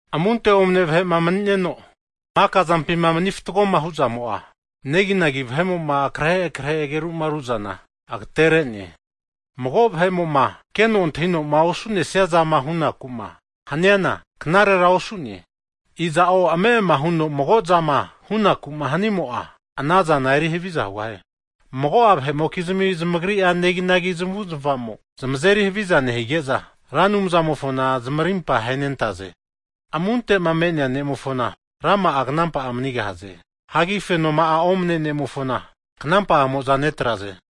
Amunte omane vahe'ma mani'neno, maka zampima mani fatgoma hu'zamo'a, neginagi vahe'mo'ma akrehe krehe ageru'ma ruzana agatere'ne. Mago vahe'mo'ma keno antahino'ma osu'nesia zama hunaku'ma haniana, knarera osugahie. Iza'o ame'ama huno mago'zama hunaku'ma hanimo'a, ana zana eri haviza hugahie. Mago'a vahe'mokizmi zamagri'a neginagi zamavu'zmava zamo zamazeri haviza nehige'za, Ra Anumzamofona zamarimpa ahenentaze. Amunte'ma me'nea ne'mofona, rama'a knampa'a manigahaze. Hagi fenoma'a omane ne'mofona knampa'amo'za netraze.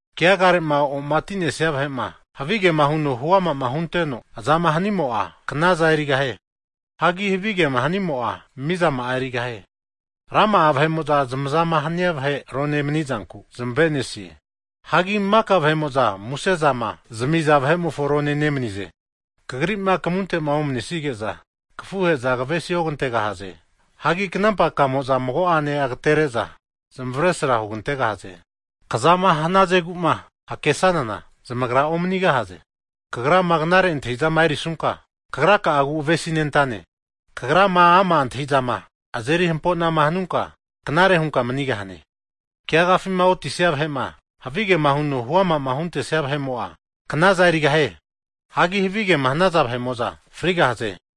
Keagare'ma omati'nesia vahe'ma havigema huno huama'ma hunteno azama hanimo'a, knazana erigahie. Hagi havi kema hanimo'a, mizama'a erigahie. Rama'a vahe'mo'za zamazama hania vahe arone manizanku zamave'nesie. Hagi maka vahe'mo'za muse zama nezami'za vahe'mofo rone nemanize. Kagrima kamunte'ma omanesige'za, kafuhe'za kavesi ogantegahaze. Hagi knampa ka'amo'za mago'ane agatere'za zamavesra hugantegahaze. Kazama hanazegu'ma hakesanana, zamagra omanigahaze. Kagrama knare antahi'zama erisunka, kagraka'agu avesinentane. Kagrama ama' antahi'zama azeri hampo'nama hanunka, knare hunka manigahane. Keagafima otisia vahe'ma havigema huno huama huntesia vahe'mo'a knaza erigahie. Hagi havigema hanaza vahe'mo'za frigahaze.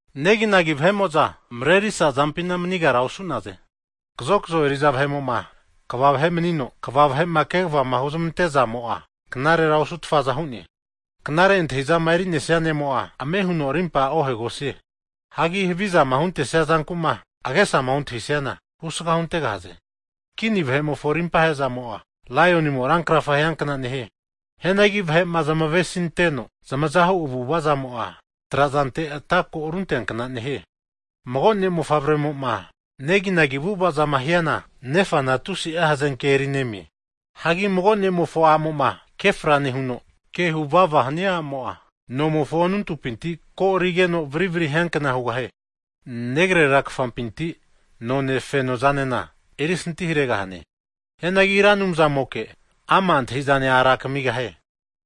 Neginagi vahe'mo'za marerisa zampina manigara osu'naze. Kazokzo eri'za vahe'mo'ma kva vahe manino, kva (princes) vahe'ma kegava huntezamo'a, knarera osutfaza hu'ne. Knare antahi'zama eri'nesia ne'mo'a, ame huno arimpa ohegosie. Hagi havizama huntesia zanku'ma agesama ontahisiana, husga huntegahaze. Kini vahe'mofo rimpa he'zamo'a, laionimo rankrafa hiankna nehie. Hianagi vahe'ma zamavesinteno zamazama hu avu'ava zamo'a, trazante ata ko arunteankna nehie. Mago ne'mofavremo'ma neginagi avu'avazama hiana, nefana tusi'a hazenke erinemie. Hagi mago ne'mofo a'mo'ma kefra nehuno, ke huvava hania a'mo'a, nomofo anuntupinti ko'arigeno varivri hiankna hugahie. Negrera negafampinti none fenozanena erisanti haregahane. Hianagi Ra Anumzamoke, ama' antahi'zane a'ra kamigahie.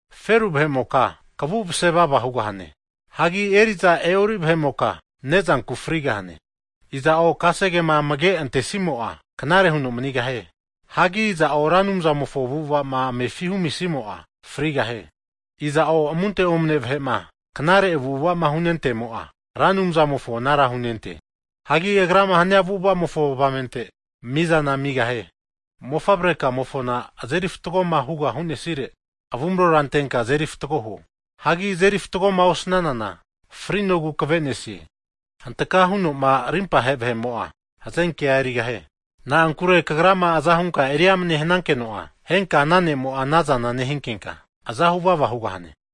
Feru vahe'moka kavu mase vava hugahane. Hagi eri'za e'ori vahe'moka ne'zanku frigahane. Iza'o kasegema amage'antesimo'a knare huno manigahie. Hagi iza'o Ra Anumzamofo avu'ava'ma amefi'ma humisimo'a, frigahie. Iza'o amunte omane vahe'ma knare avu'ava'ma hunentemo'a, Ra Anumzamofo anara hunente. Hagi agrama hania avu'avamofo avamente, mizana amigahie. Mofavre kamofona azeri fatgoma hugama hu'nesire, avumarora antenka azeri fatgo huo. Hagi azeri fatgoma osnanana, frinogu kave'nesie. Hantaka huno'ma arimpa ahe vahe'mo'a, hazenke'a erigahie. Na'ankure kagrama aza hunka eri amane hanankeno'a, henka ana ne'mo'a anazana nehinkenka aza huvava hugahane.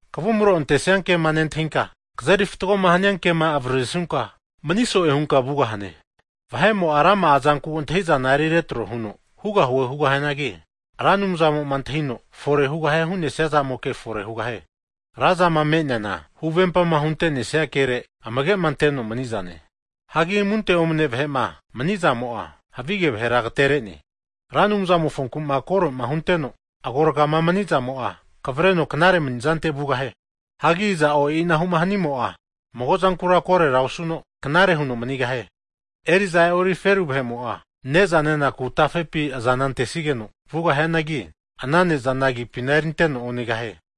Kavumro antesia kema nentahinka, kazeri fatgoma hania kema avaririsunka, mani so'e hunka vugahane. Vahe'mo'a rama'a zanku antahi'zana eri retro huno hugahue hugahianagi, Ra Anumzamo'ma antahino fore hugahie hu'nesia zamoke fore hugahie. Ra zama me'neana huvempama hunte'nesia kere, amage'ma anteno mani'zane. Hagi amunte omane vahe'ma mani'zamo'a, havige vahera agatere'ne. Ra Anumzamofonku'ma koro'ma hunteno agorga'ama mani'zamo'a, kavreno knare mani'zante vugahie. Hagi iza'o e'inahu'ma hanimo'a, mago'zankura korera osuno knare huno manigahie. Eri'za e'ori feru vahe'mo'a, ne'za nenaku tafepi azana antesigeno vugahianagi, ana ne'zana agipina erinteno onegahie.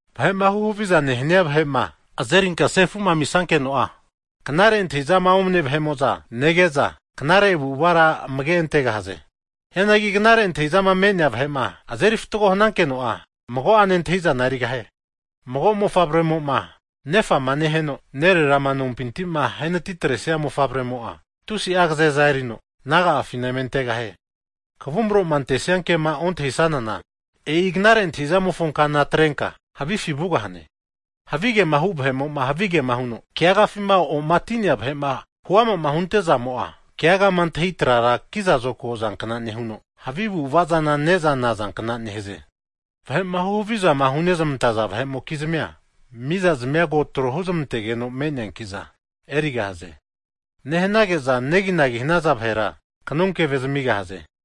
Vahe'ma huhaviza nehania vahe'ma azerinka sefu'ma amisankeno'a, knare antahi'zama omane vahe'mo'za nege'za, knare avu'avara amage antegahaze. Hianagi knare antahi'zama me'nea vahe'ma azeri fatgo hanankeno'a, mago'ane antahi'zana erigahie. Mago mofavremo'ma nefa'ma neheno, nererama nompinti'ma ahenati atresia mofavremo'a, tusi'a agazeza erino naga'afina eme antegahie. Kavumro'ma antesianke'ma ontahi'sanana, e'i knare antahi'zamofo kana atrenka havifi vugahane. Havige hu vahe'mo'ma havigema huno keagafima omati'nea vahe'ma huama'ma hunte'zamo'a, keagama antahi trara kiza zokago zankna nehuno, havi avu'ava zana ne'za nazankna nehaze. Vahe'ma huhavizama hunezmantaza vahe'mokizmi'a, mizazmia ko tro huzmantegeno me'neanki'za erigahaze. Nehanage'za neginagima hanaza vahera, kanonkeve zamigahaze.